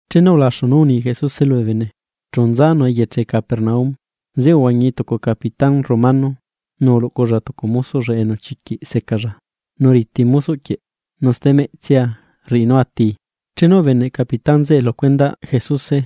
Chenu ulaxu nú uni Jesuse lubee bene, chú nzanu eyeche Capernaum. Zeꞌe uhuañi tucu capitán romano, nu uluꞌculla tucu mosoꞌlla enu chiquiꞌ secalla, nu riti mosoꞌ quieꞌ, nu stemeꞌtsia rriꞌi nú atii. Chenu ubeneꞌ capitán zeꞌe lu cuendaꞌ Jesuse,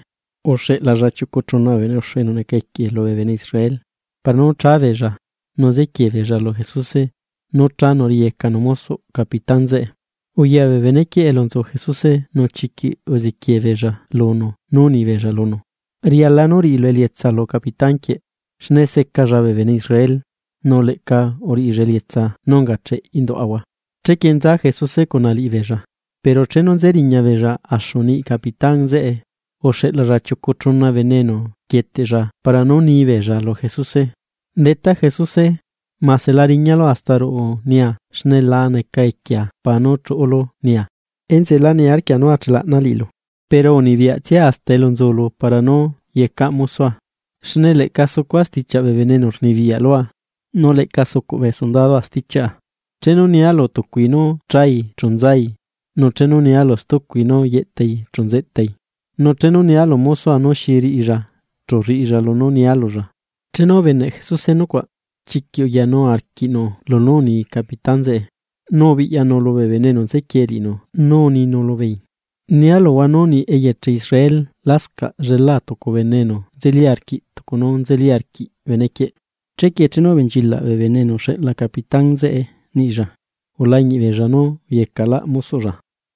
uxeꞌlalla chiucu chuna bene uxu enu neca equie lubee bene Israel, para nú chábeella nu ziquiee beella lu Jesuse nú chanu riꞌiyecanu mosoꞌ capitán zeꞌe. Uya bee benequieꞌ elu nzu Jesuse nu chiquiꞌ uziquiee beella lunu nú uni beella lunu: ―Riala nú riꞌilu elietsa lu Capitán quieꞌ. Xne secalla bee bene Israel, nu leꞌca uriꞌilla elietsa nú ungacheꞌ induaꞌahua. Chequie nza Jesuse cuna liꞌibeella, pero chenu nze riña beella axu niꞌi capitán zeꞌe, uxeꞌlalla chiucu chuna bene enu rquieteꞌlla para nú ni beella lu Jesuse: ―Detá, Jesuse mase la riñalu hasta ruꞌu nia xne la neca equiea para nú chuꞌulu nia. Enzeꞌe lá niarquia nú achelaꞌna liꞌilu, pero unibiyaꞌtsia hasta elu nzulu para nú yecaꞌ mosoa. Xne leꞌca sucua stichiaꞌ bee bene enu rnibiyaꞌ lua, nu leꞌca sucuꞌ bee sondadua stichiaꞌa. Chenu nia lu tucui nú chai chu nzai, nu chenu nia lu stucui nú yeꞌtai chu nzetai, nu chenu nia lu mosoa nú xi riꞌilla chu rriꞌilla lunú nia lulla. Chenu ubeneꞌ Jesuse nucuaꞌ, chiquiꞌ uyanu arquiꞌnu stichiaꞌ capitán zeꞌe, nu ubiꞌyanu lubee bene enu nzequie liꞌinu nu uninu lubeei: ―Nia luhua nú niꞌ eyeche Israel lascaꞌ llelá tucu bene enu nzeli arquiꞌ tucu nú nzeli arquiꞌ benequieꞌ. Chequie chenu ubenchilaꞌ bee bene enu uxeꞌla capitán zeꞌe niꞌilla, ulañiꞌ beella nú uyecaꞌlaꞌ mosoꞌlla.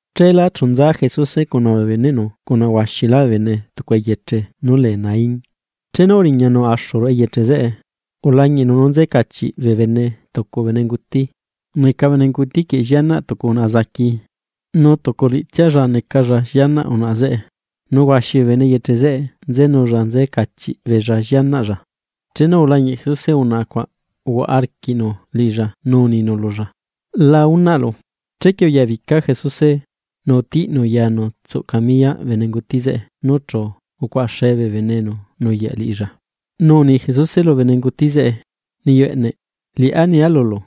Cheela chu nza Jesuse cuna bee beneꞌnu cuna huaxilá bee bene tucu eyeche nú lee Naín. Chenu uriñanu axu ruꞌu eyeche zeꞌe, ulañiꞌnu nú nze cachiꞌ bee bene tucu bene nguti. Neca bene nguti quieꞌ llianaꞌ tucu unaꞌa enu unguti niyuꞌ, nu tucu liꞌitsialla necalla llianaꞌ unaꞌa zeꞌe. Nu huaxi bee bene eyeche zeꞌe nzenulla nze cachiꞌ beella llianaꞌlla. Chenu ulañiꞌ Jesuse unaꞌa cuaꞌ, uhuaꞌa arquiꞌnu liꞌilla nu uninu lulla: ―La unaꞌlu. Chequie uyabica Jesuse, nu utiꞌnu yanu tsuꞌ camiyaꞌ bene nguti zeꞌe nu chu ucuaꞌaxe bee bene enu nuyaꞌ liꞌilla. Nu uni Jesuse lu bene nguti zeꞌe: ―Niyu eꞌneꞌ, liꞌá nia lulu: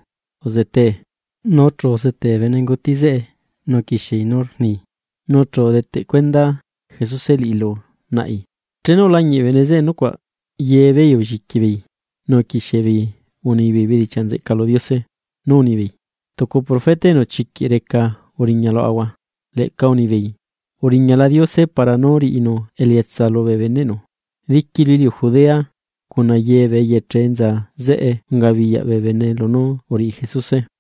¡Uzetee! Nu chu uzuculí bene nguti zeꞌe nu uquixiei nú rdichiaꞌi. Nu chu udeteꞌ cuenda Jesuse liꞌi lu naꞌi. Chenu ulañiꞌ bee bene zeꞌe nucuaꞌ, ye beei ulliqui beei nu uquixie beei unibeei bedichiaꞌ nzeꞌca lu Diose, nú unibeei: ―Tucu profeta enu chiquiꞌ reca uriña luaꞌahua. Leꞌca unibeei: ―Uriñala Diose para nú riꞌinu elietsa lubee beneꞌnu. Diqui lu iliu Judea, cuna ye bee eyeche enza zeꞌe ungabiyaꞌ bee bene lunú uriꞌi Jesuse.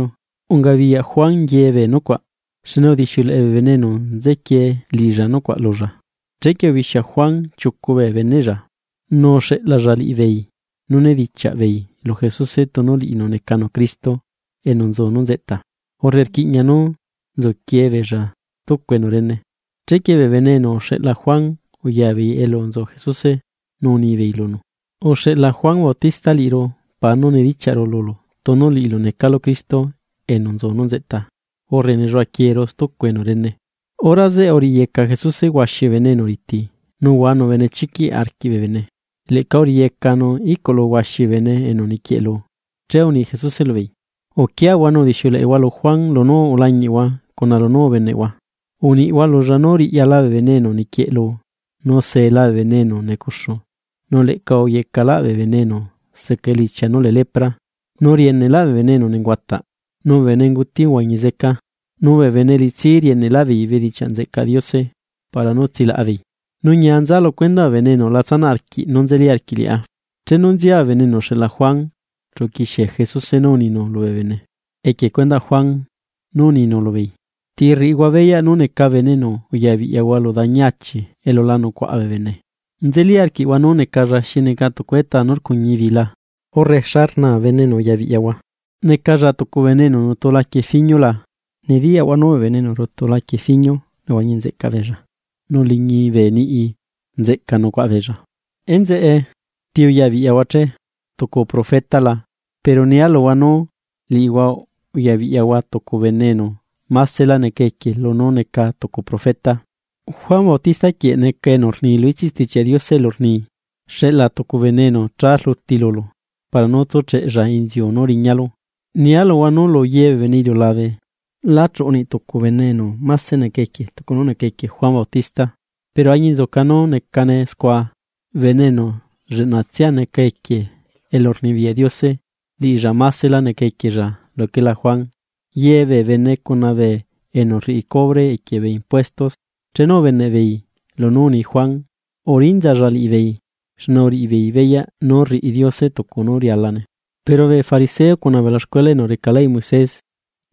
Ungabiyaꞌ Juan ye beenú unga scua, xne udixiuleꞌe bee bene enu nzequie liꞌilla nucuaꞌ lulla. Chequie ubixia Juan chiucu bee beneꞌlla, nu uxeꞌlalla liꞌibeei nú nedichiaꞌ beei lu Jesuse tunu liꞌinu necanu Cristo enu nzu nú nzeꞌta, urre rquiꞌña nú nzuquiee beella stucu enu rene. Chequie bee bene enu uxeꞌla Juan uya beei elu nzu Jesuse nu unibeei lunu: ―Uxeꞌla Juan Bautista liꞌiru para nú nidichiaꞌru lulu tunu liꞌilu necalu Cristo enu nzu nú nzeꞌta, urre nelluaꞌaquieeru stucu enu rene. Hora zeꞌe uriꞌiyeca Jesuse huaxi bee bene enu riti, nu uhuanu benechiquiꞌ arquiꞌ bee bene, leꞌca uriꞌiyecanu iꞌculu huaxi bee bene enu niquieꞌlu. Che uni Jesuse lubeei: ―Uquiahua nu udixiuleꞌehua lu Juan lunú ulañiꞌhua cuna lunú ubeneꞌhua. Uniꞌhua lulla nú riꞌyala bee bene enu niquieꞌlu, nu seela bee bene enu necuxu, nu leꞌca uyecaꞌlaꞌ bee bene enu seca elichia nú lee lepra, nu rieneꞌla bee bene enu nenguataꞌ, nu bee bene nguti uhuañi zeca, nu bee bene elitsi rieneꞌlaꞌ beei bedichiaꞌ nzeꞌcaꞌ Diose para nú tsilaꞌa beei. ¡Nu ñia nza lu cuendaꞌ bee bene enu la tsanaꞌ arquiꞌ nú nzeli arquiꞌ liꞌá! Chenu nzia bee bene enu uxeꞌla Juan, chu uquixie Jesuse nú uninu lubee bene equie cuendaꞌ Juan, nu uninu lubeei: ―¿Ti rriꞌihua beyaꞌ nú neca bene enu uyabiꞌyahua lu dañi achi elu la nucuaꞌa bee bene? ¿Nzelí arquiꞌhua nú necalla xi neca tucu etaa nú rcuñi bi la? Urre, ¿xa rnaa bene enu uyabiꞌyahua? ¿Necalla tucu bene enu nutu laquie fiñu la? Nediyaꞌhua nú bee bene enu rutu laquie fiñu nehuañi nzeꞌca beella nu liñi bee niꞌi nzeꞌca nucuaꞌa beella. Enzeꞌe, ¿Ti uyabiꞌyahua che? ¿Tucu profeta la? Pero nia luhua, nú liꞌihua uyabiꞌyahua tucu bene enu másela neca equie lunú neca tucu profeta. Juan Bautista quieꞌ neca enu rni lu ichiꞌ Stichiaꞌ Diose elu rni: Xeꞌla tucu bene enu cha rluti lulu, para nú tsúcheꞌlla inziu nú riñalu. Nia luhua nú lu ye bee bene iliulabe, lá chiuꞌu niꞌ tucu bene enu máse neca equie tucu nú neca equie Juan Bautista, pero añinzuca nú necane scua, bene enu lleꞌnatsia neca equie elurnibiyaꞌ Diose, liꞌilla másela neca equiella luquela Juan. Ye bee bene cuna bee enu rriꞌi cubre equie bee impuesto chenu ubeneꞌbeei lunú uni Juan, urinzalla liꞌibeei, xne uriꞌibeei beyaꞌ nú rriꞌi Diose tucu nú rialane, pero bee fariseo cuna bee ulaxcuela enu reca leyꞌ Moises,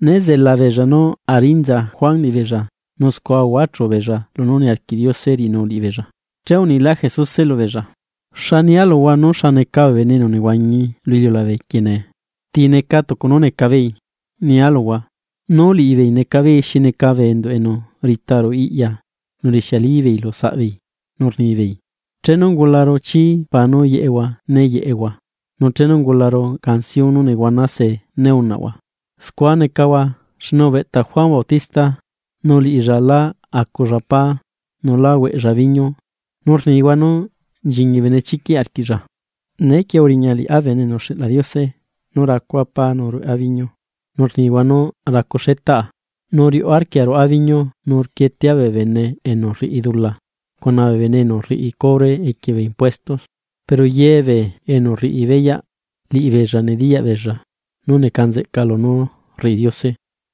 né zela beella nú arinza Juan liꞌibeella, nu scua uhuachu beei lunú niarquiꞌ Diose riꞌinu liꞌibeei. Che unilá Jesuse lubeei: ―¿Xa nia luhua nú xa neca bee bene enu nehuañi lu iliulabe quieꞌ nee? ¿Ti neca tucu nú neca beei? Nia luhua: Nú liꞌibeei neca beei xi neca bee enduꞌ enu rita ruꞌu iꞌya nu rixiali beei lu saꞌbeei nú rnibeei: “Chenu ungularu chii para nú yeꞌehua né yeꞌehua. Nu chenu ungularu canción nú nehuana se né unaꞌhua.” Scua necahua, xne ubeꞌta Juan Bautista nu liꞌilla la aculla pá, nú la huaꞌlla biñu, nu rnihua nú nchiñi benechiquiꞌ arquiꞌlla. Nee quie uriña liꞌá Bene enu uxeꞌla Diose, nú racua pá nu rueꞌa biñu, nu rnihua nú racu xetaꞌa nu riuꞌ arquia ruaꞌa biñu nu rquietea bee bene enu rriꞌi dula cuna bee bene enu rriꞌi cubre equie bee impuesto. Pero ye bee enu rriꞌi beyaꞌ, liꞌibeella nediyaꞌ beella nú neca nzeꞌca lunú rriꞌi Diose.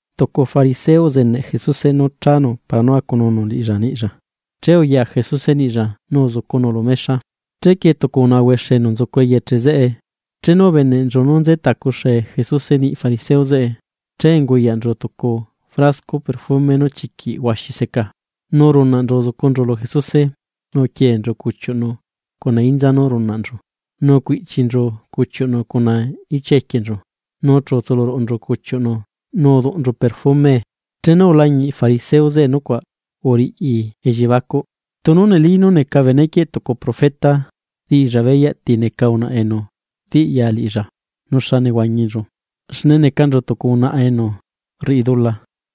Tucu bee fariseo uzeneꞌ Jesuse nú chanu para nú acununu liꞌilla niꞌlla, che uya Jesuse niꞌlla nu uzucunu lu mexa, chequie tucu unaꞌa huexe enu nzucu eyeche zeꞌe, chenu ubeneꞌnchu nú nze tacuxe Jesuse niꞌi fariseo zeꞌe, che unguyaꞌnchu tucu frasco perfume nú chiquiꞌ huaxi seca. Nu runaꞌnchu uzucunchu lu Jesuse, nu uquienchu cuchiuꞌnu cuna inza nú runaꞌnchu. Nu ucuiꞌchinchu cuchiuꞌnu cuna ichia equienchu, nu chu utsuluruꞌnchu cuchiuꞌnu nu uduꞌnchu perfumee. Chenu ulañiꞌ fariseo zeꞌe nucuaꞌ, uriꞌi elliebacuꞌ: “Tunu neli nú neca benequieꞌ tucu profeta, riꞌilla beyaꞌ ti neca unaꞌa enu rtiꞌya liꞌilla nu xa nehuañinchu, xne necanchu tucu unaꞌa enu rriꞌi dula.”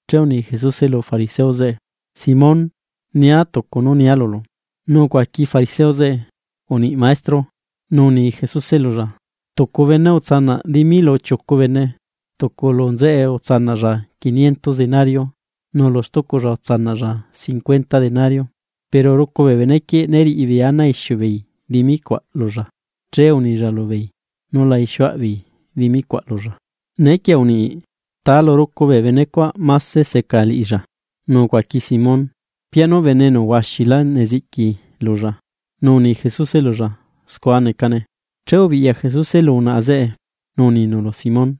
Che uni Jesuse lu fariseo zeꞌe: ―Simón, nia tucu nú nia lulu. Nu ucuaqui fariseo zeꞌe: ―Uniꞌi Maestro. Nu uni Jesuse lulla: ―Tucu bene utsanaꞌ dimi lu chiucu bene, tucu lu nzeꞌe utsanaꞌlla quiniento denario, nu lu stuculla utsanaꞌlla cincuenta denario. Pero rucu bee benequieꞌ né riꞌi beei ana aixiu beei dimi cuaꞌ lulla, che unilla lubeei nú la ixiuaꞌ beei dimi cuaꞌ lulla. Neequie uniꞌi, ¿Ta lu rucu bee benecuaꞌ máse seca liꞌilla? Nu ucuaqui Simón: ―Pianu bene enu huaxilá neziꞌqui lulla. Nu uni Jesuse lulla: ―Scua necane. Che ubiꞌya Jesuse lu unaꞌa zeꞌe, nu uninu lu Simón: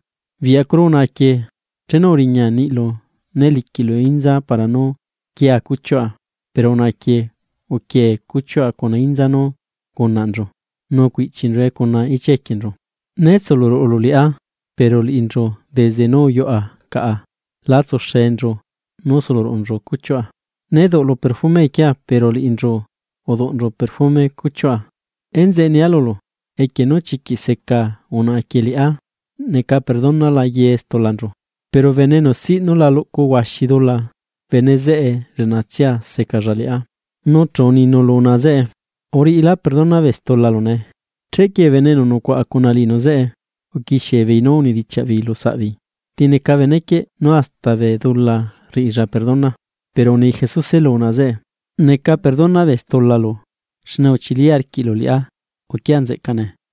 ―Biꞌyacuru unaꞌa quieꞌ chenu uriña niꞌilu né liquiꞌlu inza para nú quia cuchiuꞌa, pero unaꞌa quieꞌ uquie cuchiuꞌa cuna inza nú ungunaꞌnchu nu ucuiꞌchinchue cuna ichia equienchu. Né tsuluruꞌulu liꞌá, pero liꞌinchu desde nú uyuꞌa caꞌa la tsuxenchu nú suluruꞌunchu cuchiuꞌa. Né duꞌlu perfume equiea, pero liꞌinchu uduꞌnchu perfume cuchiuꞌa. Enzeꞌe nia lulu, equie nú chiquiꞌ seca unaꞌa quieꞌ liꞌá, neca perdonala ye stulanchu. Pero bene enu siꞌ nú la luꞌcu huaxi dula, bene zeꞌe lleꞌnatsia secalla liꞌá. Nu chu uninu lu unaꞌa zeꞌe: ―Uriꞌilá perdona bee stulalu nee. Chequie bee bene enu nucuaꞌa cuna liꞌinu zeꞌe, uquixie beei nú unidichiaꞌ beei lu saꞌbeei: ―¿Ti neca benequieꞌ, nú hasta bee dula rriꞌilla perdona? Pero uni Jesuse lu unaꞌa zeꞌe: ―Neca perdona bee stulalu, xne uchili arquiꞌlu liꞌá, uquia nzeꞌca nee.